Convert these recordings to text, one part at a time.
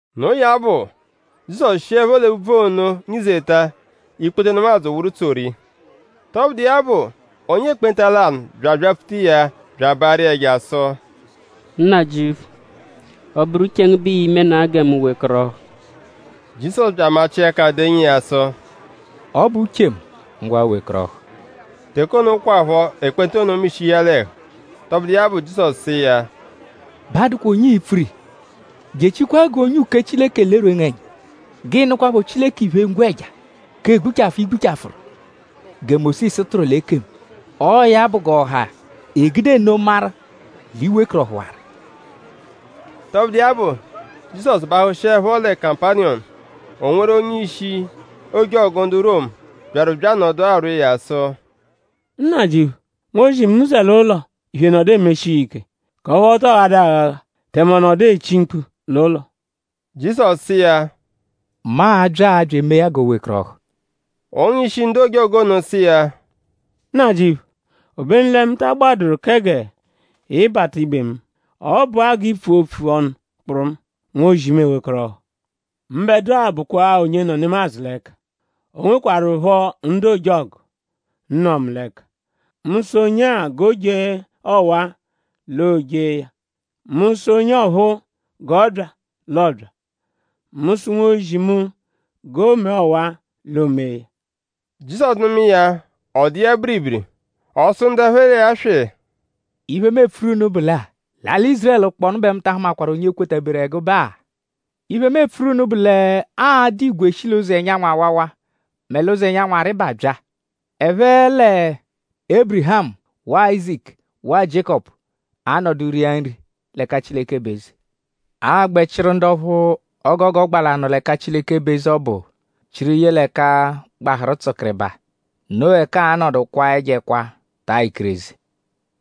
Noo ya bụ; Jizọsu shiẹpho l'úbvú ono nyizeta; ikpoto nemadzụ wụru tsoru iya. Tọbudu iya bụ; onye ekpenta lanụ bya abyapfuta iya bya abaarụ iya ẹja sụ: “Nnajịuphu; ọ -bụru uche ngu bẹ ii-menaa gẹ mu wekọrohu.” Jizọsu bya amachịa ẹka denyi iya sụ: “Ọ bụ uche mu. Ngwa wekọrohu!” Teke ono kwaphọ; ekpenta ono mishihu iya l'ẹhu. Tọbudu iya bụ; Jizọsu sụ iya: “Ba adụkwa onye ii-pfuru iya. Jechikwaa g'onye uke Chileke lerwee ngu ẹnya. G'ịi-nụkwapho Chileke iphe-ngwẹja k'egbuchafụ, i gbuchafụru; gẹ Mósisu tụru l'ekemu. Ọo ya bụ g'ọha egude nno maru l'i wekọrohuwaru.” Tọbudu iya bụ; Jizọsu bahụshiepho lẹ Kapaniyọmu; o nweru onye-ishi ojọgu ndu Romu, byaru bya anọdu arwọ iya sụ: “Nnajịuphu; nwozi mu zẹ l'ụlo; iphe nọdu emeshi iya ike; k'ọphu ọ tọo ghadụ aghagha; tẹme ọ nọdu echi mkpu l'ụlo.” Jizọsu sụ iya: “Mu a-bya-a bya emee ya g'o wekọrohu.” Onye-ishi ndu ojọgu ono sụ iya: “Nnajịuphu; obenu lẹ mu ta agbadụru kẹ g'ị bata ibe mu. Ọ bụa g'i pfua opfu ọnu kpụrumu; nwozi mu ewekọrohu. Mbẹdua bụkwa-a onye nọ nemadzụ l'ẹka; o nwekwarụpho ndu ojọgu, nọ mu l'ẹka. Mu -sụ onye-a g'o jee ọwa-a; l'o jee ya; mu -sụ onye ọphuu g'ọ bya; l'ọ bya; mu -sụ nwozi mu g'o mee ọwa-a; l'o mee ya.” Jizọsu nụma iya; ọ dụ iya biribiri. Ọ sụ ndu ẹphe l'iya swị: “Iphe, mu epfuru unu bụ lẹ-a; l'alị Ízurẹlu kpọnu bẹ mu ta ahụmakwaru onye kwetaberu ẹgube-a. Iphe, mu epfuru unu bụ l'aa-dụ igwe shi l'ụzo ẹnyanwu-awawa mẹ l'ụzo ẹnyanwu-arịba bya; ẹphe lẹ Ébirihamu; waa Áyizaku; waa Jiékọpu anọdu ria nri l'ẹka Chileke bụ eze. Aa-gbẹ chịru ndu ọphu o gogo gba l'anọ l'ẹka Chileke bụ eze ọbu chịru ye l'ẹka gbahụru tsụkiribaa. Noo ẹka aa-nọdu kwaa ẹjo ẹkwa taa ikireze.”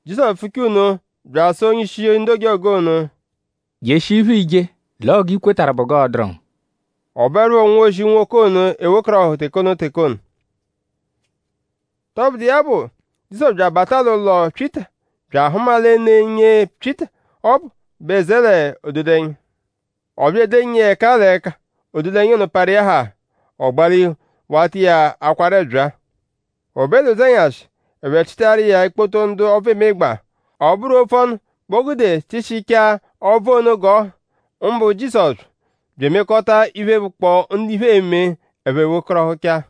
Jizọsu pfuchaa nno bya asụ onye-ishi ndu ojọgu ono: “Jeshia iphe, iije l'ọo g'i kwetarụ bụ g'ọo-dụru ngu.” Ọ bụerupho nwozi nwoke ono ewekọrohu teke ono teke ono. Tọbudu iya bụ; Jizọsu bya abata l'ụlo Pyịta bya ahụma lẹ ne nyee Pyịta ọbu bẹ zẹ l'ododẹnya. Ọ bya edenyi iya ẹka l'ẹka. Ododẹnya ono parụ iya haa. Ọ gbalihu; wata iya akwaru ẹbyaa. O be l'ụzenyashi; ẹphe chịtaru iya ikpoto ndu ọbvu emegbaa. Ọ bụru opfu ọnu bẹ o gude chịshichaa ọbvu ono g'ọ ha; mbụ Jizọsu; bya emekọta iphe, bụkpoo ndu iphe eme ẹphe wekọrohuchaa.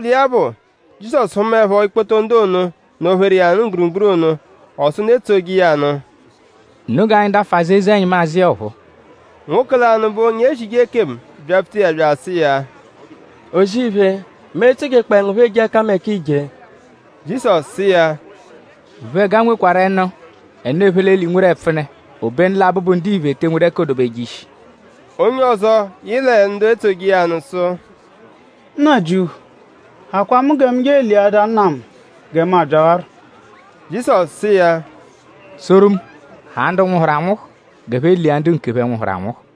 Tọbudu iya bụ; Jizọsu hụmaepho ikpoto ndu ono, nọ-pheru iya mgburugburu ono; ọ sụ ndu etsoje iya nụ: “Unu g'anyi dafụ azụ eze-ẹnyimu azụ iya ọphuu.” Nwoke lanụ, bụ onye ezije ekemu byapfuta iya bya asụ iya: “O-zì-iphe; mu e-tsojekpọe ngu phọ eje ẹkameka, iije.” Jizọsu sụ iya: “Uphẹga nwekwarụ ẹnú; ẹnù, ephe l'eli nweru ẹpfune; obenu lẹ Abụbu-Ndiphe te enwedu ẹka oo-dobeje ishi.” Onye ọzo, yị lẹ ndu etsoje iya nụ sụ: “Nnajịuphu; hakwaa mu gẹ mu je eliadaa nna mu; gẹ mu abyawarọ.” Jizọsu sụ iya: “Tsoru mu; haa ndu nwụhuru anwụhu g'ẹphe lia ndu nkephẹ, nwụhuru anwụhu.”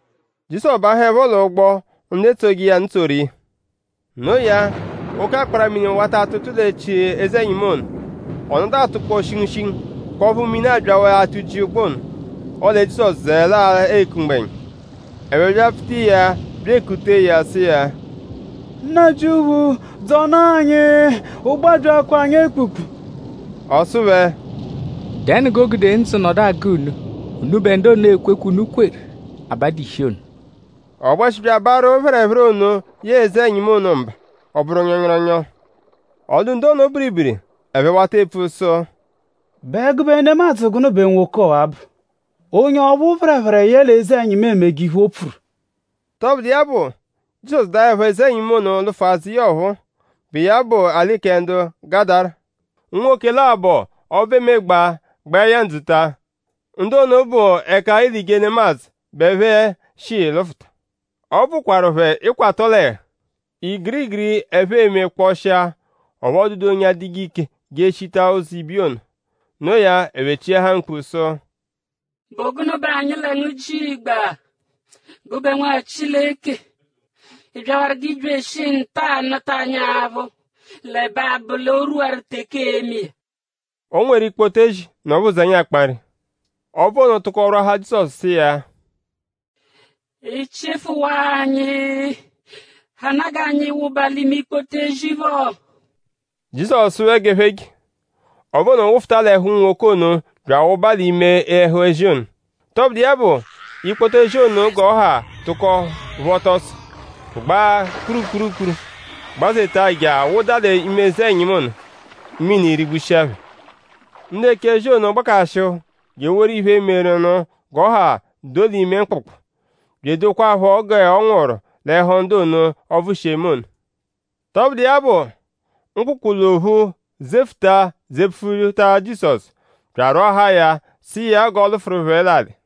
Jizọsu bahụepho l'ụgbo; ndu etsoje iya nụ tsoru iya. No iya; oke akpara-mini wata atụtu l'echi eze-ẹnyimu ono. Ọ nọdu atụkpoo shingushingu; k'ọphu mini abyawaa atụji ụgbo ono; ọle Jizọsu zẹele-a eku mgbẹnya. Ẹphe byapfuta iya bya ekutee ya; sụ iya: “Nnajịuphu; dzọnaa anyi! Ụgbo abyaakwaa anyi ekpukpu!” Ọ sụ phẹ: “?Dẹnu g'o gude ndzụ nọdu agụ unu. Unubẹ ndu ono ekwekwe, unu kweru abadu ishi ono.” Ọ gbẹshi bya abaarụ phẹrephere ono yẹe eze-ẹnyimu ono mba. Ọ bụru nyọnyoronyo. Ọ dụ ndu ono biribiri. Ẹphe wata epfupfu sụ: “?Bụ ẹgube nemadzụ gụnu bẹ nwoke ọwa-a bụ? Onye ọphu phẹrephere yẹle eze-ẹnyimu emeje iphe, o pfuru.” Tọbudu iya bụ; Jizọsu daẹpho eze-ẹnyimu ono lụfu azụ iya ọphuu, bụ iya bụ l'alị kẹ ndu Gadara; unwoke labọ, ọbvu emegbaa gba iya ndzuta. Ndu ono bụ ẹka eelije nemadzụ bẹ ẹphe shi lụfuta. Ọbvu kwarụ phẹ ịkwato l'ẹhu. Igiri igiri, ẹphe eme kpọshia; ọphu ọ dụdu onye adụje ike je eshita ụzo ibiya ono. Noo ya; ẹphe chiahaa mkpu sụ: “?Bụ gụnu bẹ anyi lẹ ngu jigba; gụbe Nwa Chileke??Ị byawaru g'ị bya eshi nta-a nụta anyi aphụ; l'ẹbe abụ l'o rwuwaru teke ee-me iya?” O nweru ikpoto ezi, nọ phẹ nwụzenya; akpa nri. Ọbvu ono tụko rwọahaa Jizọsu sụ iya: “Ị -chịfuwaa anyi; hanaa g'anyi wụba l'ime ikpoto ezi phọ.” Jizọsu sụ phẹ g'ẹphe je. Ọbvu ono wụfuta l'ẹhu unwoke ono bya awụba l'ime ẹhu ezi ono. Tọbudu iya bụ; ikpoto ezi ono g'ọ ha tụko phọta ọso; gbaa kpurukpuru gbazeta je awụda l'ime eze-ẹnyimu ono; mini rigbushia phẹ. Ndu eche ezi ono gbakashịhu je eworu iphe, meru nụ g'ọ ha doo l'ime mkpụkpu; bya edokwaaphọ g'ọ nwụru l'ẹhu ndu ono, ọbvu shi eme ono. Tọbudu iya bụ; mkpụkpu l'ophu zefụta zepfuta Jizọsu bya arwọahaa ya; sụ iya g'ọ lụfuru phẹ l'alị.